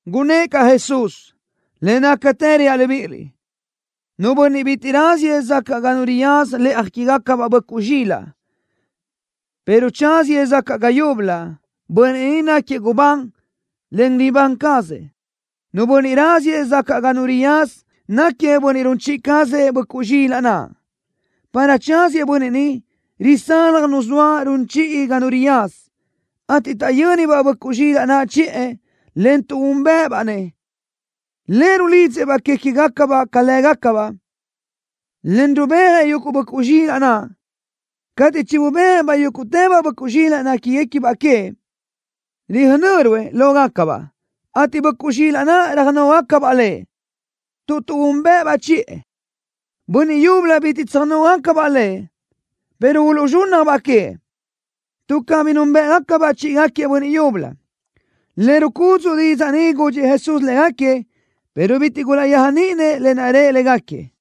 Gunnë́ʼ caʼ Jesús: —Le nácatë reaʼ libíʼiliʼ: Nu bönniʼ bitiʼ raziëʼ sacaʼ ga nu riyaza lëʼa quégacabaʼ böʼcuʼ zxilaʼ, pero tsáziëʼ sacaʼ ga yúbölö, bönniʼ ni náquiëʼ gubán, en ribán cazëʼ. Nu bönniʼ raziëʼ sacaʼ ga nu riyaza náquiëʼ bönniʼ run chiʼi cazëʼ böʼcuʼ zxilaʼ naʼ. Para tsáziëʼ bönniʼ ni, risalaj nu zoa run chiʼi ga nu riyaza, ateʼ taʼyö́nibaʼ böʼcuʼ zxilaʼ naʼ chiʼë, en tuʼúnbëʼëbaʼ-nëʼ. Lëʼ rulidzëʼ-baʼ que queë́baʼ ca lë́gacabaʼ, en rubéajëʼ yuguʼ böʼcuʼ zxilaʼ naʼ. Cateʼ chinubéajëʼ-baʼ yúguʼtëbaʼ böʼcuʼ zxilaʼ néquigacabaʼ queëʼ, röjnö́ruëʼ lógacabaʼ, ateʼ böʼcuʼ zxilaʼ naʼ röjnógacabaʼ lëʼ, tuʼ tuʼúnbëʼëbaʼ chiʼë. Bönniʼ yúbölö bitiʼ tsöjnógacabaʼ lëʼ, pero uluʼzxúnnajbaʼ queëʼ, tuʼ cabí núnbëʼgacabaʼ chíʼigaquiëʼ bönniʼ yúbölö. Le rucudzuʼ didzaʼ ni gudxëʼ Jesús légaquiëʼ, pero bitiʼ gulaʼyéajniʼinëʼ lë naʼ rëʼ légaquiëʼ.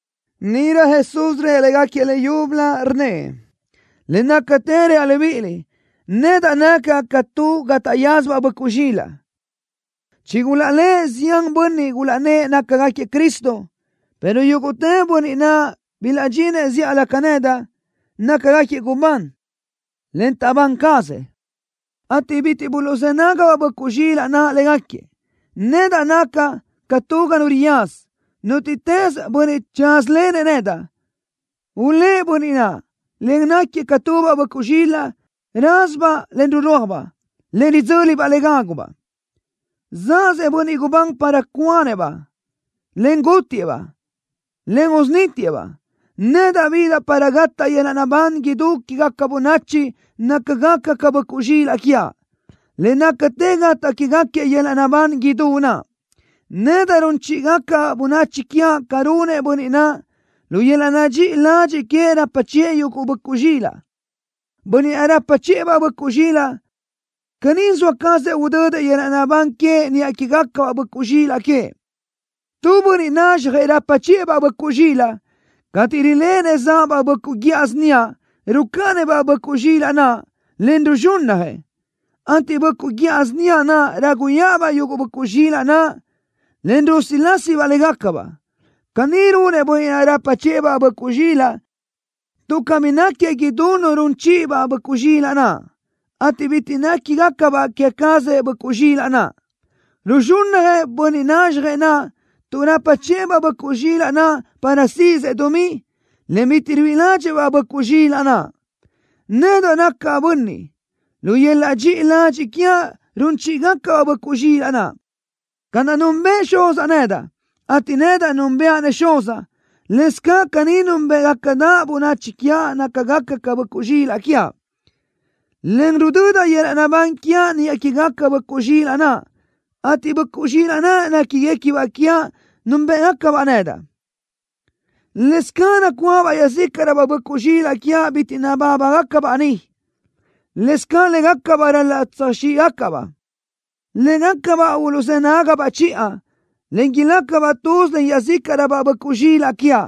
Níʼirö Jesús rëʼ légaquiëʼ leyúbölö, rnnëʼ: —Le nácatë reaʼ libíʼiliʼ: Nedaʼ nacaʼ ca tu ga taʼyázabaʼ böʼcuʼ zxilaʼ. Chigulaʼlë́ʼë zián bönniʼ gulaʼnnë́ʼ nácagaquiëʼ Cristo, pero yúguʼtë bönniʼ naʼ bilaʼdxinëʼ zíʼalö ca nedaʼ, nácagaquiëʼ gubán, en taʼbán cazëʼ, ateʼ bitiʼ buluʼzë́ nágabaʼ böʼcuʼ zxilaʼ naʼ légaquiëʼ. Nedaʼ nacaʼ ca tu ga nu riyaza. Nútiʼtës bönniʼ tsázalenëʼ nedaʼ, ulë́ʼ bönniʼ naʼ, en gáquiëʼ ca tubaʼ böʼcuʼ zxilaʼ rázabaʼ, en rurúajbaʼ, en ridzö́libaʼ le rágubaʼ. ’Zaʼzëʼ bönniʼ gubán para cuanëʼ-baʼ, en gútiëʼ-baʼ, en usunítiëʼ-baʼ. Nedaʼ bidaʼ para gataʼ yöl-laʼ naʼbán idú quégaca bönachi nácagaca ca böʼcuʼ zxilaʼ quiaʼ. Le nácatë gataʼ quégaquiëʼ yöl-laʼ naʼbán idú naʼ. Nedaʼ run chíʼigacaʼ bönachi quiaʼ ca runëʼ bönniʼ naʼ, lu yöl-laʼ dxiʼi ladxiʼ queëʼ rapa chiʼë yuguʼ böʼcuʼ zxilaʼ. Bönniʼ naʼ rapa chiʼë-baʼ böʼcuʼ zxilaʼ caní zoa cazëʼ udödëʼ yöl-laʼ naʼbán queëʼ niʼa quégacabaʼ böʼcuʼ zxilaʼ queëʼ. Tu bönniʼ nazxjëʼ rapa chiʼë-baʼ böʼcuʼ zxilaʼ, cateʼ riléʼenëʼ záʼabaʼ böʼcuʼ guíʼa síniaʼ, rucáʼanëʼ-baʼ böʼcuʼ zxilaʼ naʼ, en ruzxúnnajëʼ, ateʼ böʼcuʼ guíʼa síniaʼ naʼ ráguyaʼabaʼ yuguʼ böʼcuʼ zxilaʼ naʼ, en rusilásibaʼ légacabaʼ. Caní runëʼ bönniʼ naʼ rapa chiʼë-baʼ böʼcuʼ zxilaʼ tuʼ cabí náquiëʼ idú nu run chiʼi-baʼ böʼcuʼ zxilaʼ, ateʼ bitiʼ néquigacabaʼ que cazëʼ böʼcuʼ zxilaʼ naʼ. Ruzxúnnajëʼ bönniʼ nazxjëʼ naʼ tuʼ rapa chiʼë-baʼ böʼcuʼ zxilaʼ naʼ para síʼisëʼ dumí, en bitiʼ ruíʼi ládxëʼë-baʼ böʼcuʼ zxilaʼ naʼ. ’Nedaʼ nacaʼ bönniʼ, lu yöl-laʼ dxiʼi ladxiʼ quiaʼ run chíʼigacaʼ-baʼ böʼcuʼ zxilaʼ. Ca naʼ núnbëʼë Xuzaʼ nedaʼ, ateʼ nedaʼ núnbëʼa-nëʼ Xuzaʼ, lëscaʼ caní núnbeʼegacadaʼ bönachi quiaʼ nácagaca ca böʼcuʼ zxilaʼ quiaʼ, en rudödaʼ yöl-laʼ naʼbán quiaʼ niʼa quégacabaʼ böʼcuʼ zxilaʼ naʼ, ateʼ böʼcuʼ zxilaʼ naʼ néquiguequibaʼ quiaʼ núnbëʼgacabaʼ nedaʼ. Lëscaʼ nacuáʼabaʼ iaʼzícaʼröbaʼ böʼcuʼ zxilaʼ quiaʼ bitiʼ nabábagacabaʼ ni. Lëscaʼ légacabaʼ ral-laʼ tsöjxíʼgacaʼ-baʼ. Légacabaʼ uluʼzë́ nágabaʼ chiʼa, en ilácabaʼ tuz len iaʼzícaʼröbaʼ böʼcuʼ zxilaʼ quiaʼ,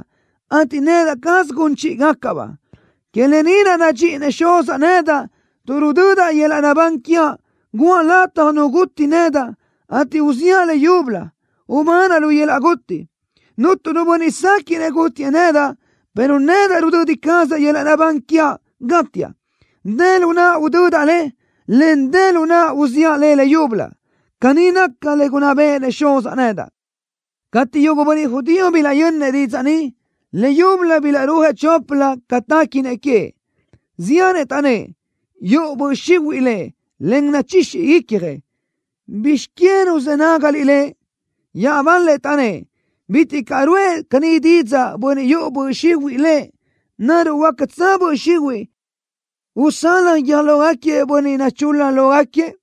ateʼ nedaʼ caz gun chíʼigacaʼ-baʼ. ’Que lë ni naʼ nadxíʼinëʼ Xuzaʼ nedaʼ, tuʼ rudödaʼ yöl-laʼ naʼbán quiaʼ, guʼa lataj nu guti nedaʼ, ateʼ uziʼa le leyúbölö, ubanaʼ lu yöl-laʼ guti. Cuntu nu bönniʼ séquiʼnëʼ gútiëʼ nedaʼ, pero nedaʼ rudödi cazaʼ yöl-laʼ naʼbán quiaʼ, gátiaʼ. Dë lu naʼa udödaʼ le, en dë lu naʼa uziʼa le leyúbölö. Caní naca le gunná béʼenëʼ Xuzaʼ nedaʼ. Cateʼ yuguʼ bönniʼ judío bilaʼyönnëʼ didzaʼ ni, leyúbölö bilaʼrúajëʼ choplö ca téquinëʼ queëʼ. Ziánëʼ taʼnnë́ʼ: —Yuʼu böʼ xihuiʼ Lëʼ, en nachixi icjëʼ. ¿Bizx que ruzë́ nágaliʼ Lëʼ? Iaʼbal-lëʼ taʼnnë́ʼ: —Bitiʼ caʼ ruʼë caní didzaʼ bönniʼ yuʼu böʼ xihuiʼ lëʼ. ¿Naruʼ huácatsö böʼ xihuiʼ usalaj guiö́j lógaquiëʼ bönniʼ nachul-la lógaquiëʼ?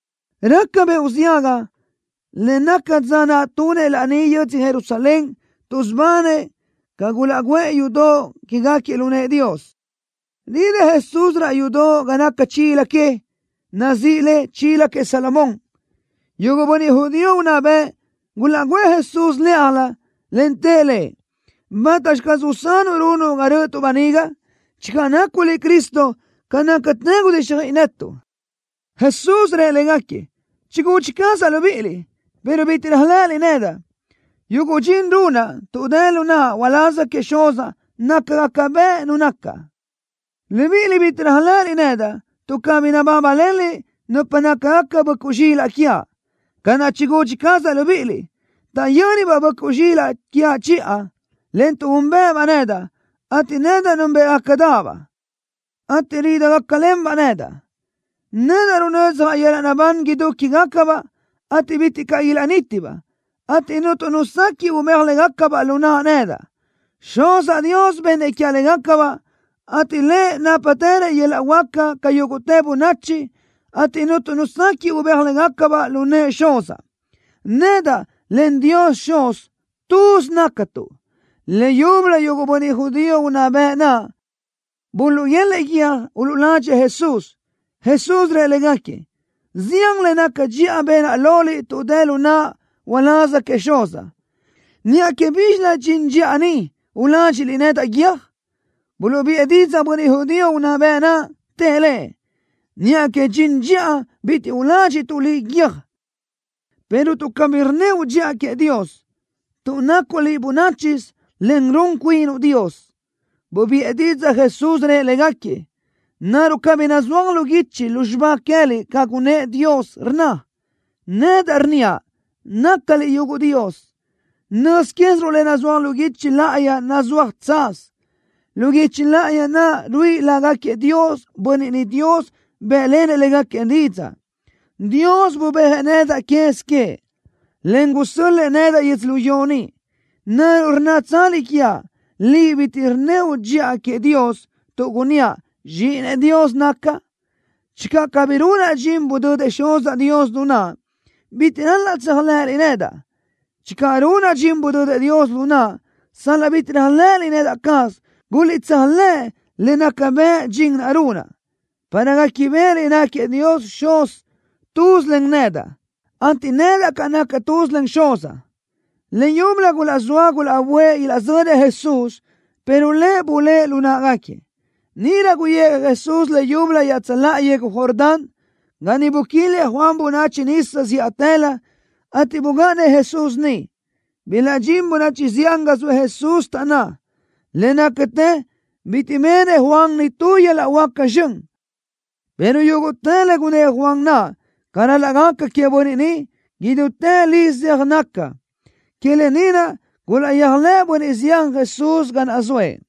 Raca beoʼ ziaga, en naca dza naʼ tunëʼ laní yödzö Jerusalén, tuʼsubanëʼ ca gulaʼguʼë yudoʼ quégaquiëʼ lu nëʼë Dios. Ridë́ʼ Jesús raʼ yudoʼ ga naca chila que, nazíʼi le Chila Queëʼ Salomón. Yuguʼ bönniʼ judío unná bëʼ gulaʼguʼë Jesús lë́ʼalö, en tëʼ Lëʼ: —¿Bátaxi caz usanuʼ runuʼ ga rö́ʼötuʼ böniga? Channö nacuʼ liʼ Cristo, ca nácatë gudíxjöiʼi netuʼ. Jesús rëʼ légaquiëʼ: —Chigudxi cazaʼ libíʼiliʼ, pero bitiʼ réajlëʼëliʼ nedaʼ. Yuguʼ dxin runaʼ tuʼ dë lu naʼa uláz queëʼ Xuzaʼ nácagaca bëʼ Nu nacaʼ. Libíʼiliʼ bitiʼ réajlëʼëliʼ nedaʼ, tuʼ cabí nabábalenliʼ nupa nácagaca böʼcuʼ zxilaʼ quiaʼ, ca naʼ chigudxi cazaʼ libíʼiliʼ. Taʼyö́nibaʼ böʼcuʼ zxilaʼ quiaʼ chiʼa, en tuʼúnbeʼebaʼ nedaʼ, ateʼ nedaʼ núnbeʼegacadaʼ-baʼ, ateʼ ridijácalenbaʼ nedaʼ. Nedaʼ runödzjaʼ yöl-laʼ naʼbán idú quégacabaʼ, ateʼ bitiʼ caʼ ilaʼnítibaʼ, ateʼ cuntu nu sequiʼ ubéaj légacabaʼ lu naʼa nedaʼ. Xuzaʼ Dios bennëʼ quiaʼ légacabaʼ, ateʼ Lëʼ nápatërëʼ yöl-laʼ huáca ca yúguʼtë bönachi, ateʼ cuntu nu sequiʼ ubéaj légacabaʼ lu nëʼë Xuzaʼ. Nedaʼ, en Dios Xuz, tuz nácatuʼ. Leyúbölö yuguʼ bönniʼ judío unná bëʼ naʼ buluʼguélëʼë guiö́j uluʼladxëʼ Jesús. Jesús rëʼ légaquiëʼ: —Zian le naca dxiʼa benaʼ loliʼ tuʼ dë lu naʼa uláz queëʼ Xuzaʼ. ¿Niʼa que bízxilö dxin dxiʼa ni uládxiʼliʼ nedaʼ guiö́j? Buluʼbiʼë didzaʼ bönniʼ judío unná bëʼ naʼ, tëʼ Lëʼ: —Niʼa que dxin dxiʼa bitiʼ uládxiʼtuʼ liʼ guiö́j, pero tuʼ cabí rnníoʼ dxiʼa queëʼ Dios, tuʼ nacuʼ liʼ bönáchisö, en run cuinuʼ Dios. Bubiʼë didzaʼ Jesús, rëʼ légaquiëʼ: —¿Naruʼ cabí nazúaj lu guichi lu xibá queë́liʼ ca gunnë́ʼ Dios, rnna: “Nedaʼ rnníaʼ: Nácaliʼ yuguʼ dios”? Nöz quéziruʼ le nazúaj lu guichi láʼayi nazúaj tsaz. Lu guichi láʼayi naʼ ruíʼi lágaquiëʼ dios, bönniʼ niʼ Dios bë́ʼlenëʼ légaquiëʼ didzaʼ. Dios bubéajëʼ nedaʼ quez queëʼ, en gusö́l-lëʼë nedaʼ yödzölió ni. ¿Naruʼ rnnátsaliʼ quiaʼ: “Liʼ bitiʼ rnníoʼ dxiʼa queëʼ Dios”, tuʼ gunníaʼ: Zxíʼinëʼ Dios nacaʼ? Channö cabí runaʼ dxin budödëʼ Xuzaʼ Dios lu naʼa, bitiʼ ral-laʼ tséajlëʼëliʼ nedaʼ. Channö runaʼ dxin budödëʼ Dios lu naʼa, sal-laʼ bitiʼ réajlëʼëliʼ nedaʼ caz, guliʼtséajlëʼ le nácagaca bëʼ dxin naʼ runaʼ, para guéquibeʼeliʼ náquiëʼ Dios Xuz tuz len nedaʼ, ateʼ nedaʼ caʼ nacaʼ tuz len Xuzaʼ. Leyúbölö gulaʼzóa gulaʼböʼë ilaʼzönëʼ Jesús, pero Lëʼ bulë́ʼ lu náʼagaquiëʼ. Níʼirö guyijëʼ Jesús leyúbölö iaʼtsöláʼa yegu Jordán, ga niʼ buquilëʼ Juan bönachi nisa zíʼatëlö, ateʼ bugáʼanëʼ Jesús niʼ. Bilaʼdxín bönachi zián ga zoëʼ Jesús, taʼnná: —Le nácatë bitiʼ benëʼ Juan nitú yöl-laʼ huáca zxön, pero yúguʼtë le gunnë́ʼ Juan naʼ ca ral-laʼ gaca queëʼ bönniʼ ni, idútë li zeaj naca. Que lë ni naʼ gulaʼyéajlëʼë bönniʼ zián Jesús ga naʼ zoëʼ.